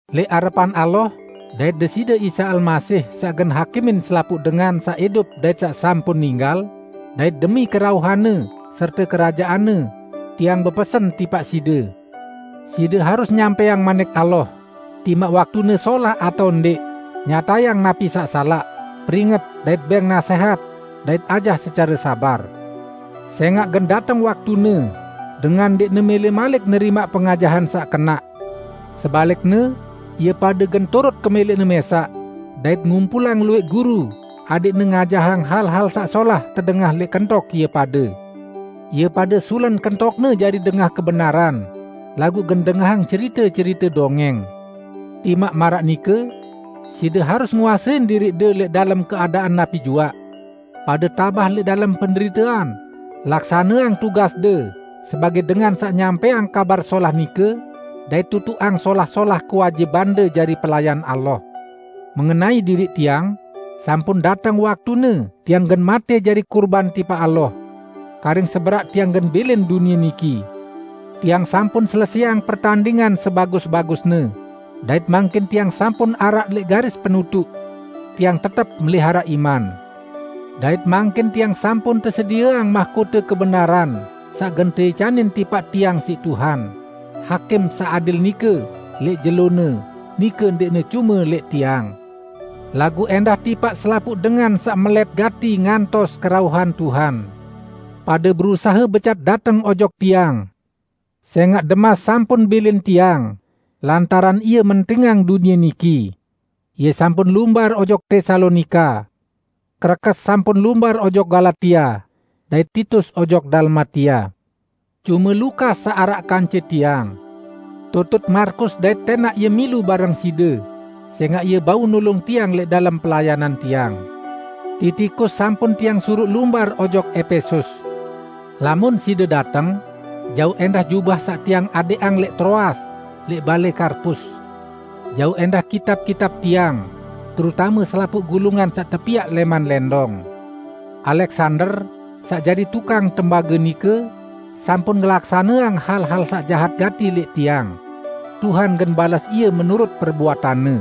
Lẽq arepan Allah dait Deside Isa Almasih saq gen hakimin selapuq dengan saq idup dait saq sampun ninggal; dait demi kerauhan-Ne serte kerajaan-Ne, tiang bepesen tipaq side: Side harus nyampẽang Manik Allah, timaq waktune solah atao ndẽq, nyatayang napi saq salaq, peringet dait bẽng nasẽhat dait ajah secare sabar. Sẽngaq gen dateng waktune dengan ndẽqne mẽlẽ malik nerimaq pengajahan saq kenaq. Sebalikne, ie pade gen turut kemẽlẽqne mẽsaq, dait ngumpulang luwẽq guru adẽqne ngajahang hal-hal saq solah tedengah lẽq kentok ie pade. Ie pade sulen kentokne jari dengah kebenaran, laguq gen dengahang cerite-cerite dongẽng. Timaq maraq nike, side harus nguasein diriqde lẽq dalem keadaan napi juaq. Pade tabah lẽq dalem penderitean, laksaneang tugasde sebagẽ dengan saq nyampẽang Kabar Solah nike dait tutuqang solah-solah kewajibande jari pelayan Allah. Mengenai diriq tiang, sampun dateng waktune tiang gen matẽ jari kurban tipaq Allah. Karing seberaq tiang gen bilin dunie niki. Tiang sampun selesẽang pertandingan sebagus-bagusne, dait mangkin tiang sampun araq lẽq garis penutuq. Tiang tetep meliharaq iman. Dait mangkin tiang sampun tesedieang mahkote kebenaran saq gen teicanin tipaq tiang siq Tuhan, Hakim saq adil nike, lẽq jelo-Ne, nike ndẽqne cume lẽq tiang, laguq ẽndah tipaq selapuq dengan saq melẽt gati ngantos kerauhan Tuhan. Pade berusahe becat dateng ojok tiang, sẽngaq Demas sampun bilin tiang lantaran ie mentingang dunie niki. Ie sampun lumbar ojok Tesalonika. Krekes sampun lumbar ojok Galatia, dait Titus ojok Dalmatia. Cume Lukas saq araq kance tiang. Tutut Markus dait tẽnaq ie milu bareng side, sẽngaq ie bau nulung tiang lẽq dalem pelayanan tiang. Titikus sampun tiang suruq lumbar ojok Epesus. Lamun side dateng, jauq ẽndah jubah saq tiang adẽqang lẽq Troas lẽq balẽ Karpus. Jauq ẽndah kitab-kitab tiang, terutame selapuq gulungan saq tepiaq lẽman lẽndong. Aleksander, saq jari tukang tembage nike sampun ngelaksaneang hal-hal saq jahat gati lẽq tiang. Tuhan gen bales ie menurut perbuatanne.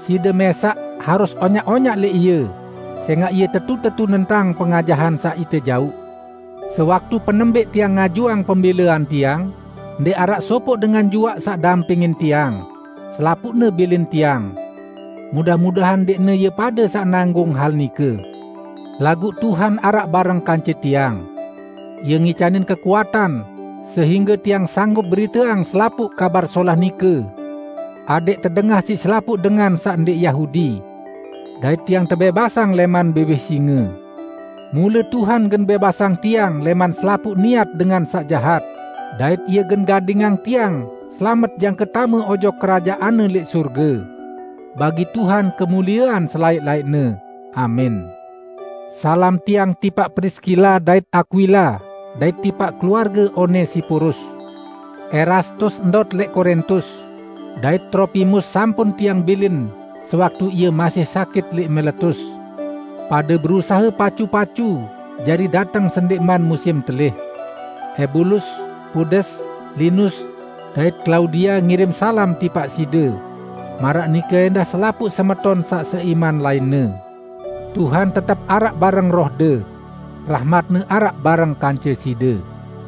Side mẽsaq harus onyaq-onyaq lẽq ie, sẽngaq ie tetu-tetu nentang pengajahan saq ite jauq. Sewaktu penembẽq tiang ngajuang pembẽlean tiang, ndẽq araq sopoq dengan juaq saq dampingin tiang; selapuqne bilin tiang. Mudah-mudahan ndẽqne ie pade saq nanggung hal nike! Laguq Tuhan araq bareng kance tiang. Ie ngicanin kekuatan sehingge tiang sanggup beriteang selapuq Kabar Solah nike, adẽq tedengah siq selapuq dengan saq ndẽq Yahudi. Dait tiang tebẽbasang lẽman biwih singe. Mule Tuhan gen bẽbasang tiang lẽman selapuq niat dengan saq jahat, dait Ie gen gadingang tiang selamet jangke tame ojok Kerajaan-Ne lẽq sorge. Bagi Tuhan kemuliean selaẽq-laẽqne! Amin. Salam tiang tipaq Priskila dait Akwila dait tipaq keluarge Onesiporus. Erastus ndot lẽq Korintus, dait Tropimus sampun tiang bilin sewaktu ie masih sakit lẽq Miletus. Pade berusahe pacu-pacu jari dateng sendẽqman musim telih. Ebulus, Pudes, Linus dait Klaudia ngirim salam tipaq side; maraq nike ẽndah selapuq semeton saq seiman lainne. Tuhan tetep araq bareng rohde. Rahmat-Ne araq bareng kance side.